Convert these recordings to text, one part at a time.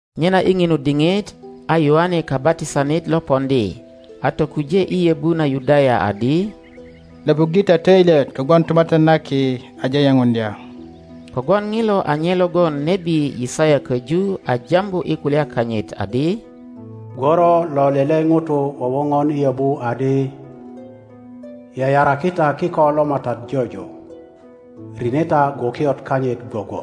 Nyena i ŋinu diŋit a Yoane Kabatisanit lo poŋdi a tokuje i yöbu na Yudaya adi, Löpuŋge ta töilyet kogwon Tumatyan na Ki aje yepuŋdya. Kogwon ŋilo a nye logon nebi Yisaya köju a jambu i kulya kanyit adi, Gworo lo lele ŋuto wowoŋon i yöbu adi, Yayaraki ta kiko lo MATAT jojo, rine ta gwokiot kanyit gwogwo.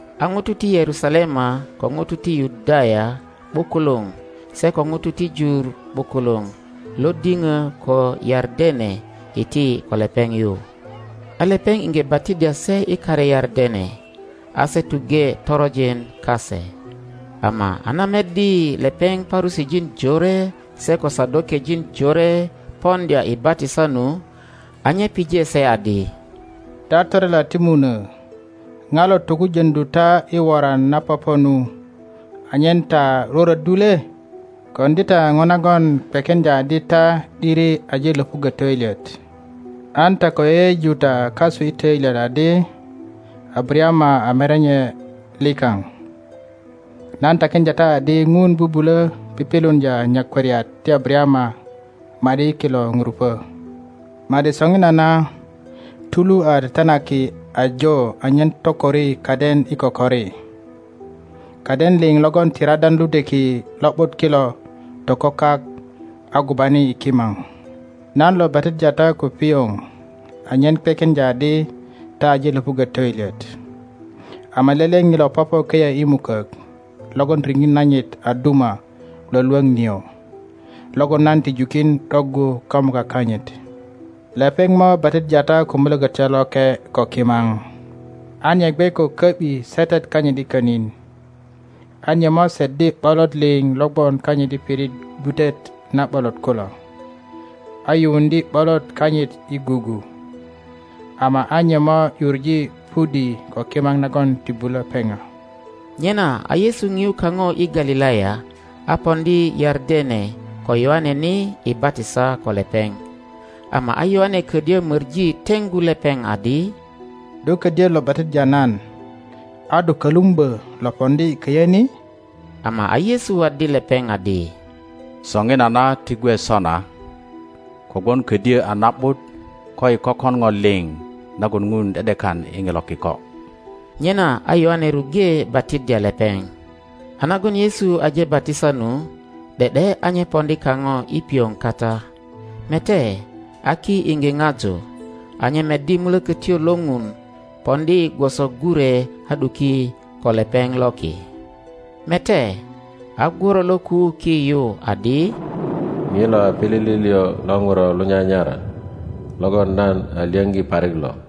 A ŋutu ti Yerusalema ko ŋutu ti Yudaya ’bukuluŋ, se ko ŋutu ti jur ’bukuluŋ lo diŋö ko Yardene, iti ko lepeŋ yu, a lepeŋ iŋge batiddya se i kare Yardene, a se tuŋge toronjin kase. Ama a na meddi lepeŋ Parusijin jore se ko Sadokejin jore poŋdya i batisa nu, a nye pije se adi, Ta torela ti munuö, ŋa lo tokujöŋdu ta i woran na popo nu, anyen ta rwörwöddu le? Koŋdi ta ŋo nagon kwekiŋdya adi ta ’diri aje löpuggö töilyet, an ta ko yeyeju ta kasu i töilyet adi, Abarayama a merenye likaŋ. Nan takiŋdya ta adi Ŋun bubulö pipiluŋdya nyakwariat ti Abarayama ma ’di i kilo ŋurupö. Ma ’di soŋinana tulu a tetenaki ajo anyen tokori kaden i kokori. Kaden liŋ logon ti radan ludweki lo ’but kilo toko kak agubani i kimaŋ. Nan lo batiddya ta ko piŋo anyen kwekiŋdya adi ta aje löpuggö töilyet. Ama lele ŋilo pöpö köyö i mukök logon riŋit nanyit a duma lwölwoŋ nio, logon nan ti jukin ’doggu kamuka kanyit. Lepeŋ mo batiddya ta ko Mulokötyo Loke ko kimaŋ. A nye gwe ko köbi setet kanyit i konin, a nye moseddi ’bolot liŋ lo gwon kanyit i pirit gwutet na ’bolot kulo, a yuŋdye ’bolot kanyit i gugu, ama a nye mo ’yuŋe pudi ko kimaŋ nagon ti bulö peŋa. Nyena a Yesu ŋiu kaŋo i Galilaya a poŋdi Yardene ko Yoane ni i batisa ko lepeŋ. Ama a Yoane ködyö möŋi teŋgu lepeŋ adi, Do ködyö lo batiddya nan, a do kölumbö lo poŋdi köyö ni! Ama a Yesu waddi lepeŋ adi, Söŋinana ti gwe sona, kogwon ködyö a na ’but koyi kökon ŋo liŋ nagon Ŋun ’de ’dekan i ŋilo kiko. Nyena a Yoane ruŋge batiddya lepeŋ. a nagon Yesu aje batisa nu, ’de ’de a nye poŋdi kaŋo i piŋo kata, mete, a ki iŋge ŋaju, a nye meddi Mulökötyo lo Ŋun poŋdi gwoso gure a ’duki ko lepeŋ loki; mete, a gworo lo kuu ki yu adi, ŋilo a pilili liŋ lo Ŋuro lo nyanyara, logon nan a lyöŋgi parik lo.